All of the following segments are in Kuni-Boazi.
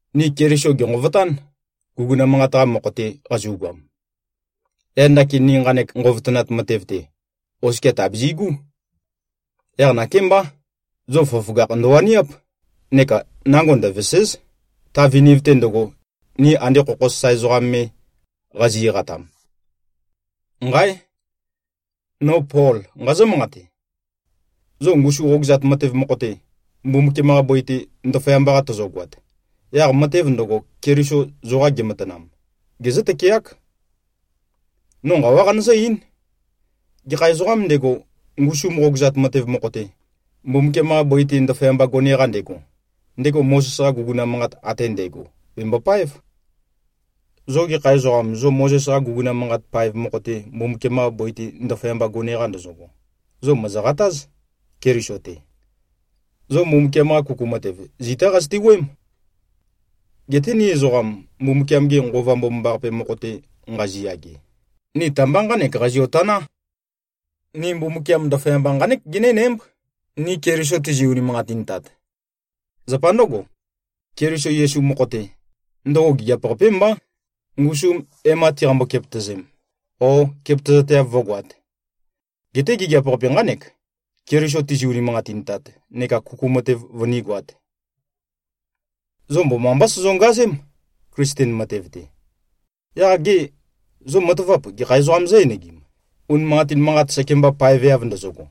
Ni Keliso gènqovotán, guguna manqat-qa mokho-te qazu꞉goam. Yaq ndakin ni nqanek nqovotønat matev-te, oskia tàbizi꞉gú. Yaq nakémbá, zo føgøføgakh ndøwaniáp, neka nango ndøvèse᷄z, ta viniv-te ndøgo, ni ande khokho sasae ezoqam me qazi꞉-eqatam. Nqáe! No Pol, nqazǿ-manqate. Zo ngusu qogøzat matev mokho-te, Mbumbukiam-qa bøi-te ndaføyamba-qa tozogoat, yaq matev ndøgo, Keliso zoqa gematanam, gezǿ-tøkeák. No nqawá qanøzǿ-eín: Gekha ezoqām ndego, ngusu qogøzat matev mokho-te, Mbumbukiam-qa bøi-te ndaføyamba gone-qa ndego, ndego Mozes-qa guguna manqat ate ndægo bembopáev. Zo gekha ezoqam, zo Mozes-qa guguna manqat paev mokho-te, Mbumbukiam-qa bøi-te ndaføyamba gone-qa ndozogo, zo mòzoqatáz, Keliso-te. Zo Mbumbukiam-qa kuku matev, zitá qazøte-wuøém. Geté ni ezoqam, Mbumbukiam-ge Nqova Mbomambaqape mokho-te nqaziyage, ni ta-mba nqánek qazio-taná: Ni Mbumbukiam ndaføyamba nqánek genénǽmb, ni Keliso tizi꞉-unimanqatintat. Zapa ndǿgo, Keliso Yesu mokho-te, ndøgo gigiap-qapé mbá, ngusum e-má tiqambø-kepøtø̀zēm, ó, kepøtøzateav vø̄goat. Geté gigiap-qape nqánek, Keliso tizi-unimanqatintat neka kuku matev vønígoāt. Zo mbomambá sozongazém, Klisten matev-te. Yaq gê, zo matavap, gekha ezoqām zǿ-enegim, unimanqatin manqat sekemba paeveav ndozogo.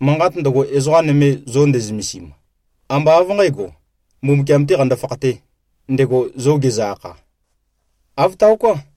Manqat ndøgo, ezoqa nøme zo ndezømesim, ambá av nqǣgo, Mbumbukiam-tē qando-fakhatē, ndego zo gezø-akha. Āv taoká.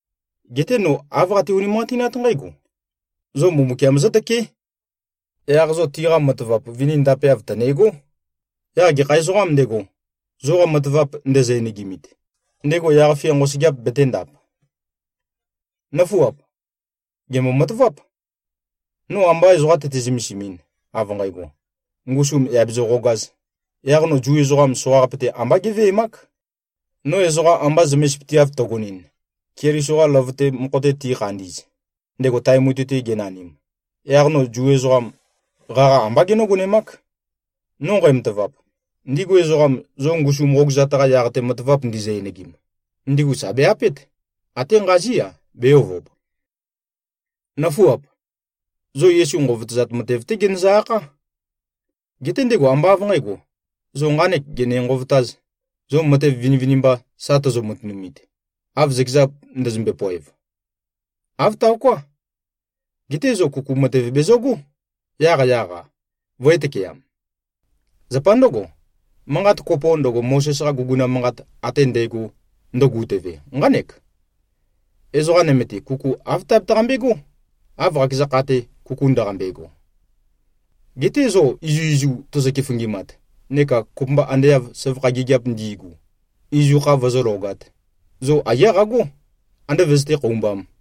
Geté no āv qate-unimanqatinát nqǽgo: Zo Mbumbukiam zǿtøké. Yaq zo tiqa matavap vini ndapeav tø̀ne꞉gó. Yaq gekha ezoqām ndego, zoqa matavap ndezø-enegimit, ndego yaq-fia nqosøgeap betēndap. Nǿfuap! Gèmbo-mataváp. No amba ezoqa tøte-zømesimɨn, av nqægo, ngusum yà bezøqogāz, yaq no Zu ezoqam soqaqape-te ambá géveemák. No ezoqa amba zømesipøteav tøgonɨn, Keliso-qa løvøte mokho-te tikhandi꞉z, ndego tae mutui-te genanim, yaq no Zu ezoqam, qaqa ambá genǿgonemák. No nqæmatavap, ndigu ezoqam zo ngusu qogøzat-qa yaq-te matavap ndizø-enegim, ndigu sà be-apét, até nqazí-a, bē-ovob. Nǿfuap! Zo Yesu nqovotøzat matev-té genøzø-akhá. Geté ndego ambá av nqǣgo, zo nqānek gene-nqovotāz, zo matev vinivinimba sa tozo-matønumit, av zøkeza ndøzømbe-poev. Āv taoká. Geté zo kuku matev bezøgó, yaqyaq-a, vø̄e-tøkeam. Zapa ndǿgo, manqat kopo ndøgo, Mozes-qa guguna manqat ate ndægo ndøgutøve, nqánek: “Ezoqa nøme-te, kuku āv tabetaqambe꞉gó, av qakeza kha-te kuku ndaqambe꞉go.” Geté zo izuizu tozo-keføngimat, neka kopømba ande av søvakha gigiap ndi꞉gu, izu kha vøzǿløgāt, zo aiyá qagó, andé vøzøté-khoumbām.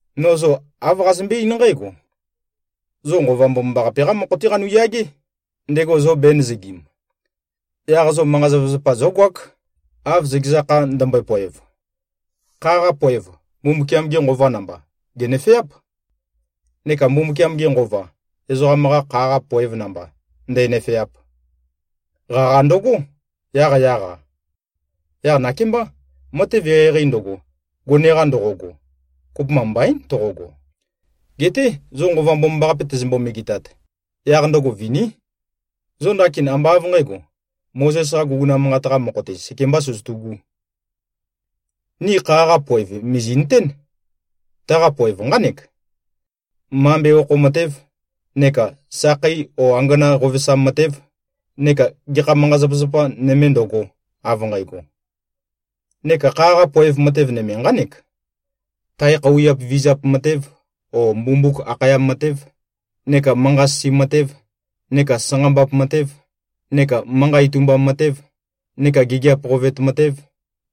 No zo āv qazømbé-eín nqǽgo: Zo Nqova Mbomambaqape-qá mokho-té qanuyagé, ndego zo bēnøzøgim. Yaq zo manqa-zapazapa zógoák, av zøkeza kha ndømbøe-poev. Kha-qa poev, Mbumbukiam-ge Nqova namba, gènøfeáp. Neka Mbumbukiam-ge Nqova, ezoqam-qa kha-qa poev namba ndē꞉nø̄fēāp. Qaqa ndøgó, yaqyaq-a. Yaq nakémbá, matev eqeieqei ndøgo, gone-qa ndoqogo, kopømba mbaín toqogo. Geté zo Nqova Mbomambaqape tezømbo-megetat, yaq ndøgo viní. Zo ndakin ambá av nqǣgo, Mozes-qa guguna manqat-qa mokho-te sekembā søzøtu꞉gū. Ni kha-qa poev mìzi꞉nøtén. Taqa poev nqánek: Mambe okho matēv, neka sakhei o angana qovesam matēv, neka gekha manqa-zapazapa nøme ndøgo, av nqægo. Neka kha-qa poev nøme nqánek: Tae khøuwiap vizap matēv o mbumbuk akhayam matēv, neka manqa-sisi matēv, neka sanqambap matēv, neka manqa itumbam matēv, neka gigiap qovet matēv,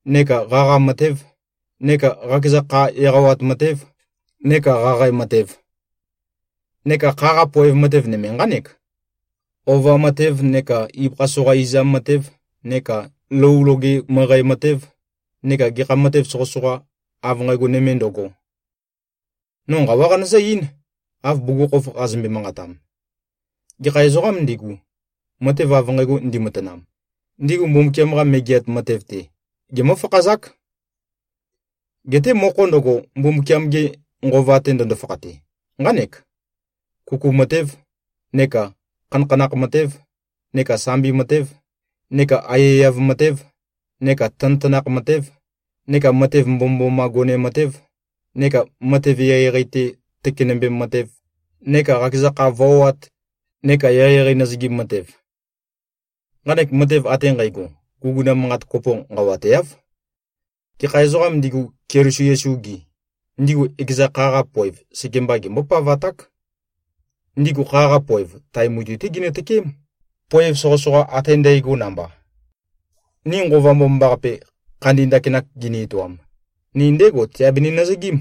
neka qaqa matēv, neka qakeza kha eqawat matēv, neka qaqae matev. Neka kha-qa poev nøme nqánek: Ova matēv neka ibøkha soqa izam matēv neka lou loge møqæ matēv neka gekha matev soqøsoqa av nqægo nøme ndøgo. No nqawá qanøzǿ-eín, av bugukhokhof qazømbe-manqatam: Gekha ezoqām ndigu, matev av nqægo ndimatanam, ndigu Mbumbukiam-qa Megeat Matev-te gemǿ-fakhazák. Geté mokho ndøgo, Mbumbukiam-ge Nqova-te ndøndo-fakhate, nqánek: Kuku matēv, neka khanakhanakh matēv, neka sambi matēv, neka aiyaiyav matēv, neka tanøtanakh matēv, neka matev mbomømboma gone matēv, neka matev eqeieqei-te tøkenømbem matev, neka qakeza kha voat neka eqeieqei nøzøgim matev. Nqanek matev ate nqægo, guguna manqat kopo nqawateáv. Gekha ezoqām ndigu, Keliso Yesu-gi, ndigu ekeza kha-qa poev sekemba gembó-pavaták. Ndigu kha-qa poev, tae mutui-té ginø-tøkeém, poev soqøsoqa ate ndægo namba. Ni Nqova Mbomambaqape, khandi ndakinak gini-etoam, ni ndégo teabeni-nøzøgím.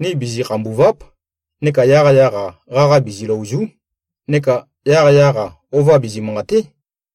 Ni bizi-khambùva᷄p, neka yaqyaq-a qaqa biziløòzu᷄, neka yaqyaq-a ova bizi-manqàte᷄.